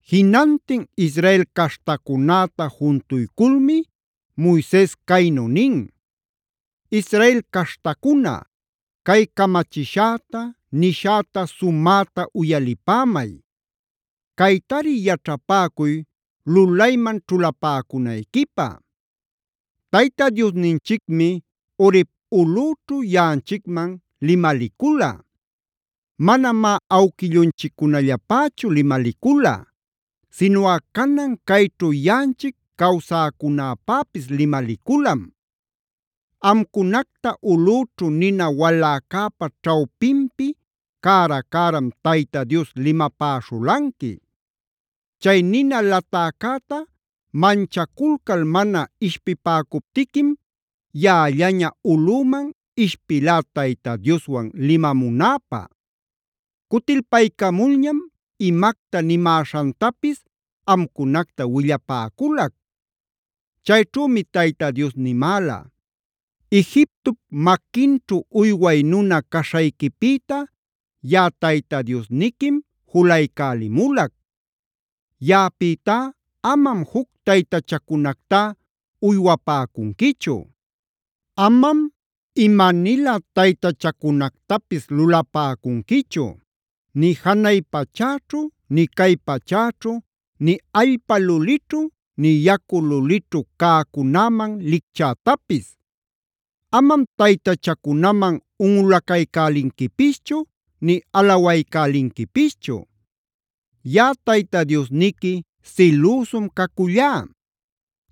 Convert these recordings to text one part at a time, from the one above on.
Jinantin Israel caśhtacunäta juntuyculmi Moises caynu nin: “Israel caśhtacuna, cay camachishäta, nishäta sumäta uyalipämay. Caytari yaćhapäcuy lulayman ćhulapäcunayquipä. “Tayta Diosninchicmi Horeb ulꞌüćhu yaꞌanchicman limalicula. Manamá awquillunchiccunallapächu limalicula, sinuꞌa canan cayćhu yanꞌanchic cawsäcunäpäpis limaliculam. Amcunacta ulꞌüćhu nina waläcäpa ćhawpinpi cära-cäram Tayta Dios limapäśhulanqui. Chay nina latäcäta manchaculcal mana ishpipäcuptiquim yaꞌallaña ulꞌüman ishpilá Tayta Dioswan limamunäpä. Cutilpaycamulñam imacta nimäśhantapis amcunacta willapäculac. Chayćhümi Tayta Dios nimäla: ‘Egiptop maquinćhu uyway nuna caśhayquipïta yaꞌa Tayta Diosniquim julaycälimulac. Yaꞌapïtá amam juc taytachacunactá uywapäcunquichu. Amam imanilä taytachacunactapis lulapäcunquichu; nï janay pachäćhu, nï cay pachäćhu, nï allpa lulićhu, nï yacu lulićhu cäcunäman licchätapis. Amam taytachacunaman unꞌulaycälinquipischu nï alawaycälinquipischu.b Yaꞌa Tayta Diosniqui silüsum cacullá.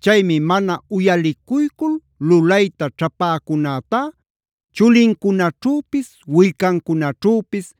Chaymi mana uyalicuycul lulayta ćhapäcunätá chulincunaćhüpis, willcancunaćhüpis,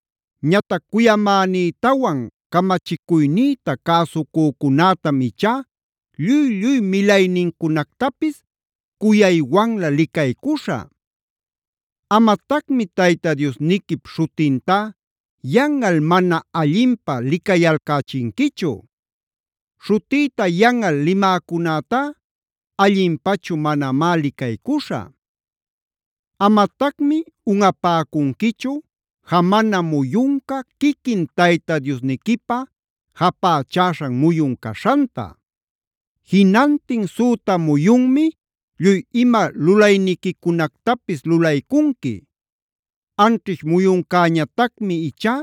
Ñatac cuyamänïtawan camachicuynïta cäsucücunätam ichá lluy-lluy milaynincunactapis cuyaywanlä licaycuśhä.c “ ‘Amatacmi Tayta Diosniquip śhutintá yanꞌal mana allinpä licayalcächinquichu.d Śhutïta yanꞌal limäcunätá allinpachu manamá licaycuśhä. “ ‘Amatacmi unꞌapäcunquichu jamana muyunca quiquin Tayta Diosniquipä japächäśhan muyun caśhanta.e Jinantin süta muyunmi lluy ima lulayniquicunactapis lulaycunqui. Anćhish muyuncäñatacmi ichá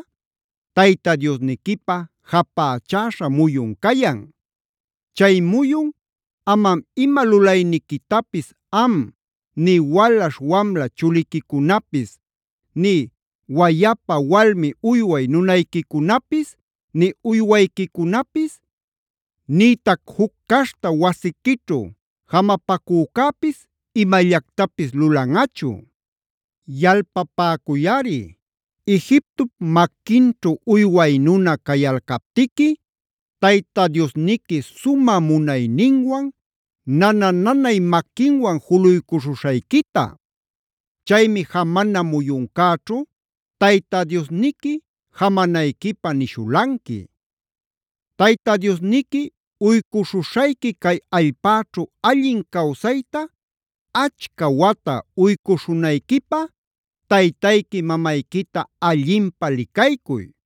Tayta Diosniquipä japächäśha muyun cayan. Chay muyun amam ima lulayniquitapis am,f nï walaśh wamla chuliquicunapis, nï wayapa-walmi uyway nunayquicunapis, nï uywayquicunapis, nïtac juc caśhta wasiquićhu jamapacücäpis imallactapis lulanꞌachu. Yalpapäcuyꞌari Egiptop maquinćhu uyway nuna cayalcaptiqui Tayta Diosniqui sumä munayninwan, nana-nanay maquinwan juluycuśhuśhayquita. Chaymi jamana muyuncäćhu Tayta Diosniqui jamanayquipä nishulanqui. “ ‘Tayta Diosniqui uycuśhuśhayqui cay allpäćhu allin cawsayta achca wata uycuśhunayquipä taytayqui mamayquita allinpä licaycuy.g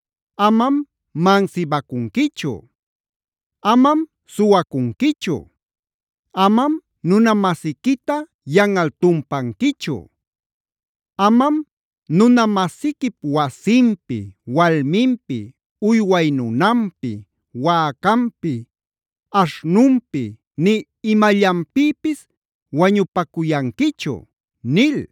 “ ‘Amam mansibacunquichu.i “ ‘Amam suwacunquichu.j “ ‘Amam nuna-masiquita yanꞌal tumpanquichu.k “ ‘Amam nuna-masiquip wasinpi, walminpi,l uyway nunanpi, wäcanpi, aśhnunpi, nï imallanpïpis wañupacuyanquichu’ nil.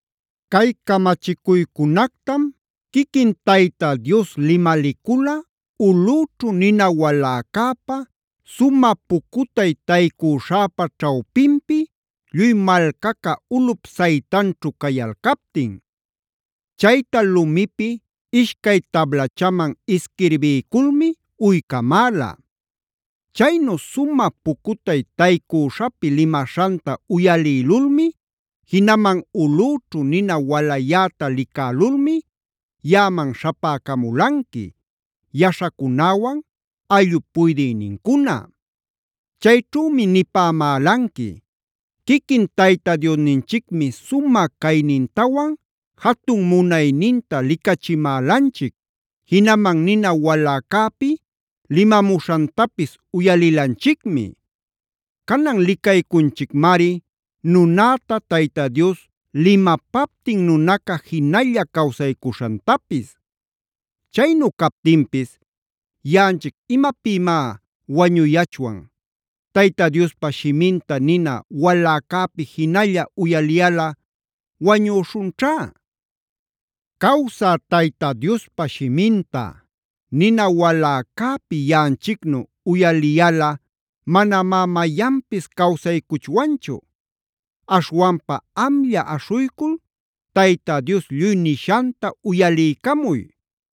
“Cay camachicuycunactam quiquin Tayta Dios limalicula ulꞌüćhu nina waläcäpa, sumä pucutay taycüśhäpa ćhawpinpi lluy malcaca ulꞌup saytanćhu cayalcaptin. Chayta lumipi ishcay tablachaman isquirbiyculmi uycamäla. Chaynu sumä pucutay taycüśhapi limaśhanta uyalïlulmi, jinaman ulꞌüćhu nina walayäta licälulmi yaꞌaman śhapäcamulanqui yaśhacunäwan ayllup puydïnincuna. Chayćhümi nipämälanqui: ‘Quiquin Tayta Diosninchicmi sumä caynintawan jatun munayninta licachimälanchic, jinaman nina waläcäpi limamuśhantapis uyalilanchicmi. Canan licaycunchicmari nunäta Tayta Dios limapaptin nunaca jinalla cawsaycuśhantapis. Chaynu captinpis ¿yaꞌanchic imapïmá wañuyachwan? Tayta Diospa shiminta nina waläcäpi jinalla uyaliyalꞌa wañüśhunćhá. Cawsä Tayta Diospa shiminta nina waläcäpi yaꞌanchicnu uyaliyalꞌa manamá mayanpis cawsaycuchwanchu.m Aśhwanpa amlla aśhuycul Tayta Dios lluy nishanta uyaliycamuy.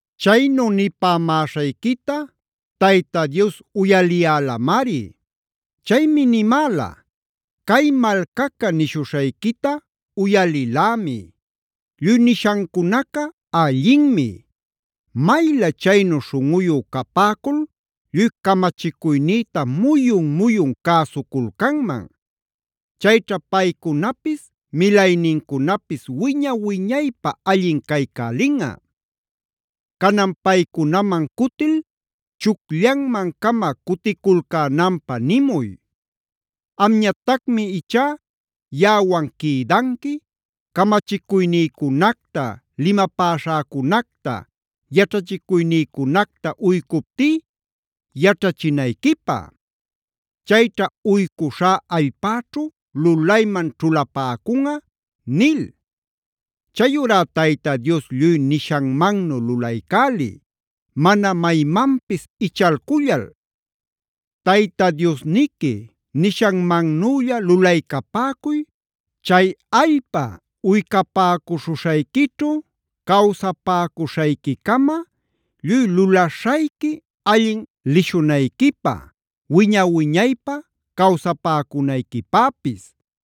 “Chaynu nipämäśhayquita Tayta Dios uyaliyälamari. Chaymi nimäla: ‘Cay malcaca nishuśhayquita uyalilämi. Lluy nishancunaca allinmi. Maylä chaynu śhunꞌuyu capäcul lluy camachicuynïta muyun-muyun cäsuculcanman. Chayćha paycunapis milaynincunapis wiña-wiñaypä allin caycälinꞌa. Canan paycunaman cutil chucllanman-cama cuticulcänanpä nimuy. Amñatacmi ichá yaꞌawan quïdanqui camachicuynïcunacta, limapäśhäcunacta, yaćhachicuynïcunacta uycuptí yaćhachinayquipä. Chayćha uycuśhá allpäćhu lulayman ćhulapäcunꞌa’ nil. Chayurá Tayta Dios lluy nishanmannu lulaycäliy, mana maymanpis ichalcullal. Tayta Diosniqui nishanmannülla lulaycapäcuy, chay allpa uycapäcuśhuśhayquićhu cawsapäcuśhayquicama lluy lulaśhayqui allin lishunayquipä, wiña-wiñaypä cawsapäcunayquipäpis.